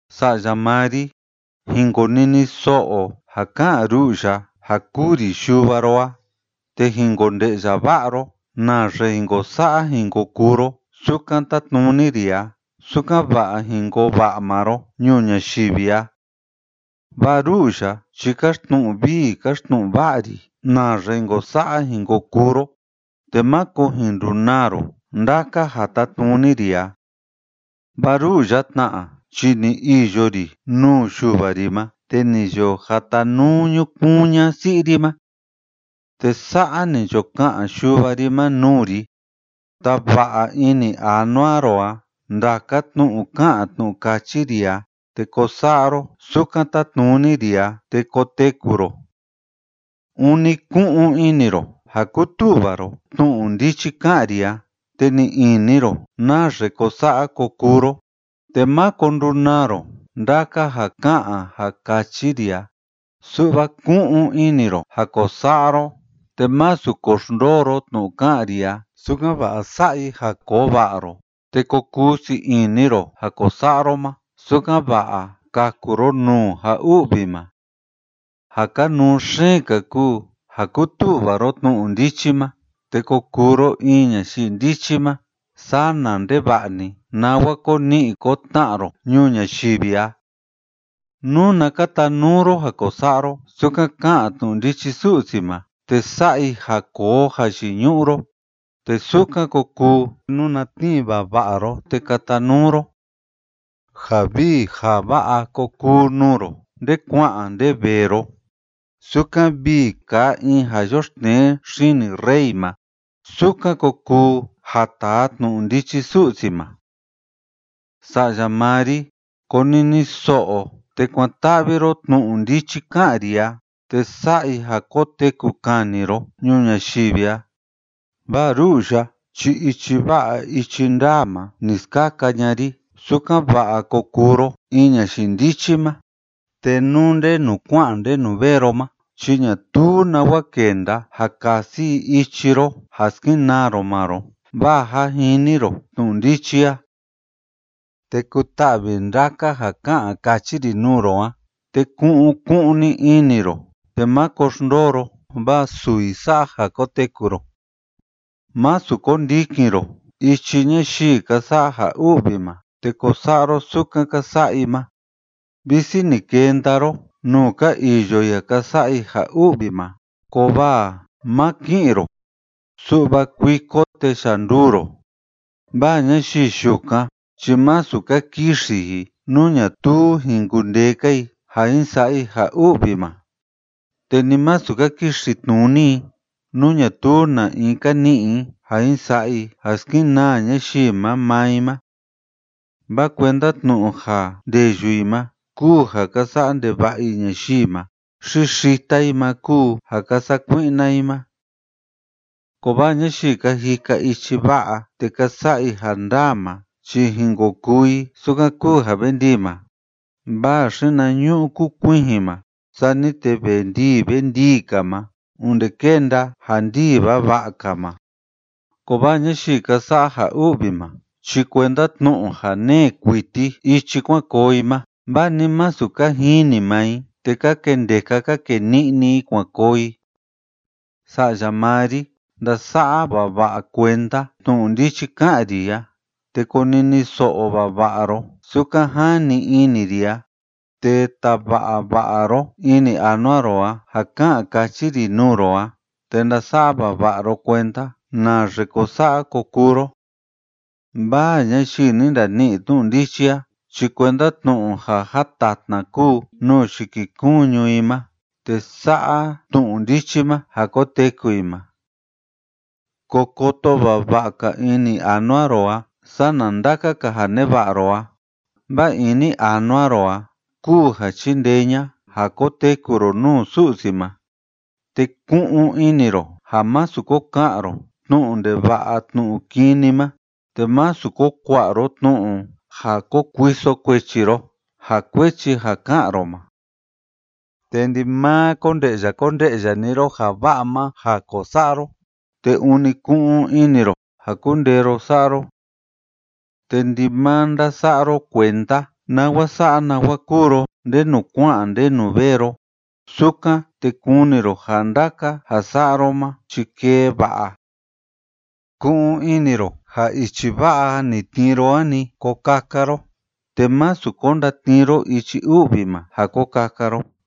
Sa'ya maa ri, jin konini so'o ja ká'an ru'u ya ja kúu ri yuva ro a, te jin konde'ya va'a ro naxe jin ko sa'a jin ko kuu ro sukan tátnuni ri a, sukan‑va'a jin koo va'a maa ro ñuu ñayivi a. Vaa ru'u ya chi káxtnu'u vii káxtnu'u va'a ri naxe jin ko sa'a jin ko kuu ro, te máko jin ndunaa ro ndaka ja tátnuni ri a. Vaa ru'u ya tna chi ni iyo ri nuu yuva ri ma te ni yo jatanuu ñukuun ña'a si'i ri ma. Te sa'a ni yo ka'an yuva ri ma nuu ri: “Tava'a ini anua ro a ndaka tnu'u ká'an tnu'u káchi ri a, te ko sa'a ro sukan tátnuni ri a, te koteku ro. Ûni ku'un ini ro ja kutu'va ro tnu'u ndichi ká'an ri a, te ni'i ini ro naxe ko sa'a ko kuu ro, te máko ndunaa ro ndaka ja ká'an ja káchi ri a, su'va ku'un ini ro ja ko sa'a ro, te másu ko xndoo ro tnu'u ká'an ri a sukan‑va'a sa'a i ja koo va'a ro, te ko kuu sii ini ro ja ko sa'a ro ma, sukan‑va'a kaku ro nuu ja u'vi ma. Ja kanuu xeen‑ka kúu ja kutu'va ro tnu'u ndichi ma te ko kuu ro in ñayii ndichi ma, sana ndeva'a‑ni nawa ko ni'i ko tna'a ro ñuu ñayivi a. Nuna katanuu ro ja ko sa'a ro sukan ká'an tnu'u ndichi Su'si ma, te sa'a i ja koo jayiñu'u ro, te sukan ko kuu nuna tnii vava'a ro te katanuu ro. Ja vii ja va'a ko kuu nuu ro nde kua'an nde vee ro. Sukan vii kaa in ja yoxtnee xini rey ma, sukan ko kuu ja taa tnu'u ndichi Su'si ma.” Sa'ya maa ri, konini so'o te kuan‑ta'vi ro tnu'u ndichi ká'an ri a, te sa'a i ja koteku kani ro ñuu ñayivi a, vaa ru'u ya chi ichi va'a ichi ndaa ma ni skaka ña'a ri, sukan‑va'a ko kuu ro in ñayii ndichi ma. Te nú ndenu kua'an ndenu vee ro ma chi ñatuu nawa kenda ja kasi i ichi ro ja skenaa ro maa ro, vaa jâ jini ro tnu'u ndichi a. Te kuta'vi ndaka ja ká'an káchi ri nuu ro a, te ku'un ku'un‑ni ini ro te máko xndoo ro, vaa suu i sa'a ja koteku ro. Másu ko ndikin ro ichi ñayii ka sa'a ja u'vi ma te ko sa'a ro sukan ka sa'a i ma. Visi ni kenda ro nuu ka iyo i ja ka sa'a i ja u'vi ma, kovaa má ki'in ro, su'va kuiko te yanduu ro. Vaa ñayii yukan chi masu ka kixi i nú ñatuu jin kundee‑ka i ja jin sa'a i ja u'vi ma, te ni masu ka kixi tnuni i nú ñatuu na‑in ka ni'i i ja jin sa'a i ja skenaa ñayii ma maa i ma. Vaa kuenda tnu'u ja ndeyu i ma kúu ja ka sa'a ndeva'a i ñayii ma, xi xita i ma kúu ja ka sakui'na i ma. Kovaa ñayii ka jika ichi va'a te ka sa'a i ja ndaa ma chi jin ko kuu i sukan kúu ja ve ndii ma, vaa xinañu'u kukuijin ma, sani te ve ndii ve ndii‑ka ma onde kenda ja ndii vava'a‑ka ma. Kovaa ñayii ka sa'a ja u'vi ma chi kuenda tnu'u ja nee kuiti ichi kuan koo i ma, vaa ni masu ka jini maa i, te ka kendeka ka kee ni'ni i kuan koo i. Sa'ya maa ri, ndasa'a vava'a kuenda tnu'u ndichi ká'an ri a, te konini so'o vava'a ro sukan jani ini ri a, te tava'a va'a ro ini anua ro a ja ká'an káchi ri nuu ro a te ndasa'a vava'a ro kuenda naxe ko sa'a ko kuu ro. Vaa ñayii ni ndani'i tnu'u ndichi a chi kuenda tnu'u ja jatatna kúu nuu yikikuñu i ma, te sa'a tnu'u ndichi ma ja koteku i ma. Ko koto vava'a‑ka ini anua ro a sana ndaka‑ka ja neva'a ro a, vaa ini anua ro a kúu ja chindee ña'a ja koteku ro nuu Su'si ma. Te ku'un ini ro ja másu ko ka'an ro tnu'u ndeva'a tnu'u kini ma, te másu ko kua'a ro tnu'u ja ko kuiso kuechi ro ja kuechi ja ká'an ro ma. Te ndimaa konde'ya konde'ya‑ni ro ja va'a ma ja ko sa'a ro, te ûni ku'un ini ro ja kundee ro sa'a ro. Te ndimaa ndasa'a ro kuenda nawa sa'a nawa kúu ro ndenu kua'an ndenu vee ro. Sukan, te kuni ro ja ndaka ja sa'a ro ma chi kee va'a. Ku'un ini ro ja ichi va'a ni tnii ro a‑ni ko kaka ro, te másu ko ndatnii ro ichi u'vi ma ja ko kaka ro.